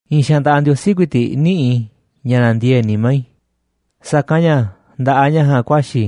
I̱i̱n xaanꞌ nda̱ꞌaꞌ Ndiosí ku̱i̱ti̱ꞌ niꞌíꞌ i̱ ña̱ nandiee̱ꞌ nimá i̱, sa̱kanꞌ ña̱ nda̱ꞌaꞌ ña̱ ja̱a̱nꞌ ku̱a̱xi̱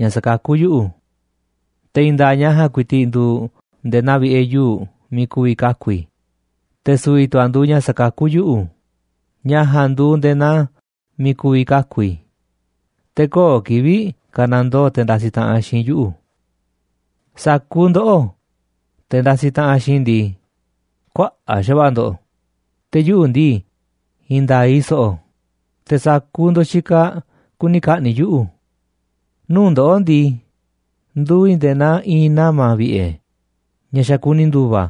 ña̱ sakakú yuꞌu̱. Te̱ i̱i̱n nda̱a̱ꞌ ña̱ ja̱a̱nꞌ ku̱i̱ti̱ꞌ nduuꞌ nde̱e̱ naa vi̱ꞌe̱ yuu̱ꞌ miiꞌ ku̱vi̱ kaku̱ i̱, te̱ su̱vi̱ tu̱ a̱ nduuꞌ ña̱ sakakú yuꞌu̱, ña̱ ja̱a̱nꞌ nduuꞌ nde̱e̱ naa miiꞌ ku̱vi̱ kaku̱ i̱, te̱ köo̱ꞌ kivi̱ꞌ ka̱nandoo te̱ ndasiꞌ taꞌanꞌ xiinꞌ i̱ yuꞌu̱. Sa̱kuuꞌ ndoꞌó, te̱ ndasiꞌ taꞌanꞌ xiinꞌ i̱ ndii, kuaꞌa̱ꞌ xa̱va̱ꞌa̱ ndo̱ꞌ, te̱ yuꞌu̱ ndii, i̱i̱n nda̱a̱ꞌ i̱ so̱ꞌo̱, te̱ sa̱kuuꞌ ndo̱ꞌ xikaꞌ kuni ka̱ꞌni̱ꞌ yuꞌu̱. Nuu̱ꞌ ndoꞌó ndii, nduuꞌ i̱ nde̱e̱ naa i̱i̱n nama̱ vi̱ꞌe̱ ña̱ xa̱ kuni ndu̱va̱,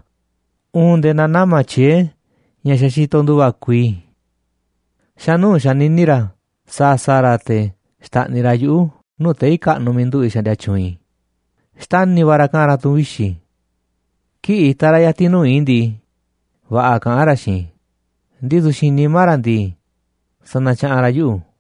uun nde̱e̱ naa nama̱ tyiee̱ ña̱ xa̱ xitoꞌ ndu̱va̱ kuii. Xa̱ nuu̱ꞌ xanini ra̱ sa̱a̱ sa̱a̱ ra̱ te̱ xta̱ꞌniꞌ ra̱ yuꞌu̱ nuu̱ꞌ tei̱ kaꞌnuꞌ miiꞌ nduꞌu̱ꞌ i̱ xaꞌndia tyu̱u̱n i̱, xtani̱ va̱ ra̱ kaꞌa̱n ra̱ tu̱n vixi̱. Kii̱ꞌ itaꞌ ra̱ ya̱ti̱n nuu̱ꞌ i̱ ndii, va̱ꞌa̱ kaꞌán ra̱ xiinꞌ i̱, ndisu̱ xiinꞌ nimá ra̱ ndii, sanatyaꞌanꞌ ra̱ yuꞌu̱.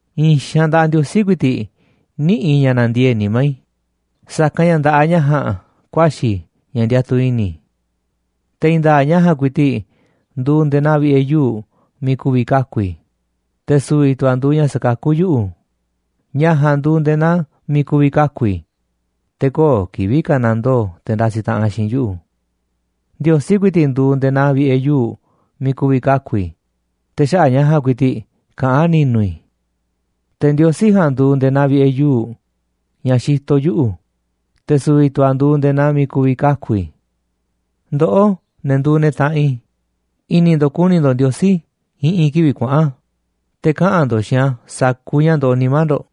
I̱i̱n xaanꞌ nda̱ꞌaꞌ Ndiosí ku̱i̱ti̱ꞌ niꞌíꞌ i̱ ña̱ nandiee̱ꞌ nimá i̱, sa̱kanꞌ ña̱ nda̱ꞌaꞌ ña̱ ja̱a̱nꞌ ku̱a̱xi̱ ña̱ ndiatuꞌ i̱ni̱ i̱. Te̱ i̱i̱n nda̱a̱ꞌ ña̱ ja̱a̱nꞌ ku̱i̱ti̱ꞌ nduuꞌ nde̱e̱ naa vi̱ꞌe̱ yuu̱ꞌ miiꞌ ku̱vi̱ kaku̱ i̱, te̱ su̱vi̱ tu̱ a̱ nduuꞌ ña̱ sakakú yuꞌu̱, ña̱ ja̱a̱nꞌ nduuꞌ nde̱e̱ naa miiꞌ ku̱vi̱ kaku̱ i̱, te̱ köo̱ꞌ kivi̱ꞌ ka̱nandoo te̱ ndasiꞌ taꞌanꞌ xiinꞌ i̱ yuꞌu̱. Ndiosí ku̱i̱ti̱ꞌ nduuꞌ nde̱e̱ naa vi̱ꞌe̱ yuu̱ꞌ miiꞌ ku̱vi̱ kaku̱ i̱, te̱ xaꞌa̱ꞌ ña̱ ja̱a̱nꞌ ku̱i̱ti̱ꞌ kaꞌán ni̱nu̱ i̱. Te̱ Ndiosí ja̱a̱nꞌ nduuꞌ nde̱e̱ naa vi̱ꞌe̱ yuu̱ꞌ ña̱ xitoꞌ yuꞌu̱, te̱ su̱vi̱ tu̱ a̱ nduuꞌ nde̱e̱ naa miiꞌ ku̱vi̱ kaku̱ i̱. Ndoꞌó, ne̱ nduuꞌ ne̱ taꞌanꞌ i̱, i̱ni̱ ndo̱ꞌ ku̱ni̱ ndo̱ꞌ Ndiosí i̱ꞌi̱n kivi̱ꞌ kuaꞌa̱n, te̱ kaꞌa̱n ndo̱ꞌ xiinꞌ a̱ sa̱kuuꞌ ña̱ ndoꞌoꞌ nimá ndo̱ꞌ,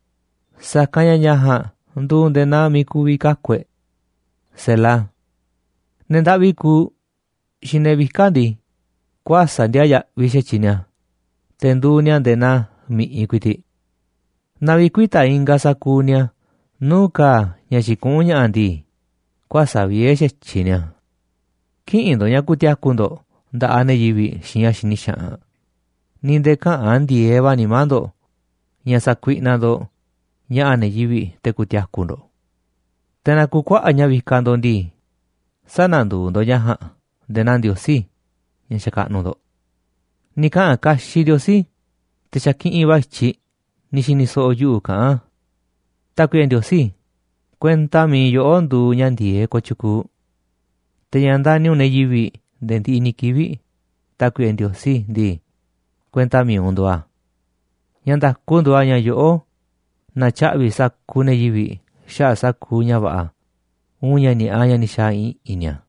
sa̱kanꞌ ña̱ ña̱ ja̱a̱nꞌ nduuꞌ nde̱e̱ naa miiꞌ ku̱vi̱ kaku̱ e̱ꞌ. Ne̱ ndaꞌvi kuuꞌ xiinꞌ ne̱ vika̱ꞌ ndii, kuäsa̱ꞌ ndiaa yaꞌviꞌ xa̱tyiꞌ ni̱a̱, te̱ nduuꞌ ni̱a̱ nde̱e̱ naa mi̱ꞌiꞌ ku̱i̱ti̱ꞌ. Naaꞌ vi̱kuita̱ ingaꞌ sa̱kuuꞌ ni̱a̱ nuu̱ꞌ ka̱a̱ ña̱ xikuꞌún ña̱ꞌa̱ ndii, kuäsa̱ꞌ vie̱ xa̱tyiꞌ ni̱a̱. Kï̱ꞌi̱n ndo̱ꞌ ña̱ ku̱ti̱a̱ku̱ ndo̱ꞌ nda̱ꞌaꞌ ne̱ yivi̱ꞌ xiinꞌ ña̱ xini xaꞌanꞌ, ni̱ nde̱e̱ käꞌa̱n ndi̱e̱eꞌ va̱ nimá ndo̱ꞌ ña̱ sa̱kuiꞌnaꞌ ndo̱ꞌ ña̱ꞌa̱ ne̱ yivi̱ꞌ te̱ ku̱ti̱a̱ku̱ ndo̱ꞌ. Te̱ naaꞌ ku̱kuaꞌa̱ꞌ ña̱ vikaꞌ ndo̱ꞌ ndii, sä̱na̱nduuꞌ ndo̱ꞌ ña̱ ja̱a̱nꞌ nde̱e̱ naa ndiosí ña̱ xakaꞌnuꞌ ndo̱ꞌ. Ni̱ kaꞌa̱n kaxiꞌ Ndiosí, te̱ xa̱ kiꞌinꞌ va̱ i̱tyiꞌ ni̱ xi̱ni̱ so̱ꞌo̱ yuꞌu̱ kaꞌán a̱. Tákuiꞌe Ndiosí, kuenta mi̱iꞌ yoꞌó nduuꞌ ña̱ ndi̱e̱eꞌ kooꞌ tyukuuꞌ. Te̱ ña̱ ndani̱ u̱nꞌ ne̱ yivi̱ꞌ nde̱e̱ ndiꞌiꞌ ni̱ kivi̱ꞌ, Tákuiꞌe Ndiosí ndii, kuenta mi̱iꞌ u̱nꞌ nduuꞌ a̱. Ña̱ nda̱ku nduuꞌ a̱ ña̱ yoꞌó na̱tyaꞌvi̱ sa̱kuuꞌ ne̱ yivi̱ꞌ xaꞌa̱ꞌ sa̱kuuꞌ ña̱ va̱ꞌa̱ uun ña̱ ni̱a̱ꞌa ña̱ ni̱ xa̱a̱ i̱ꞌi̱n ni̱a̱.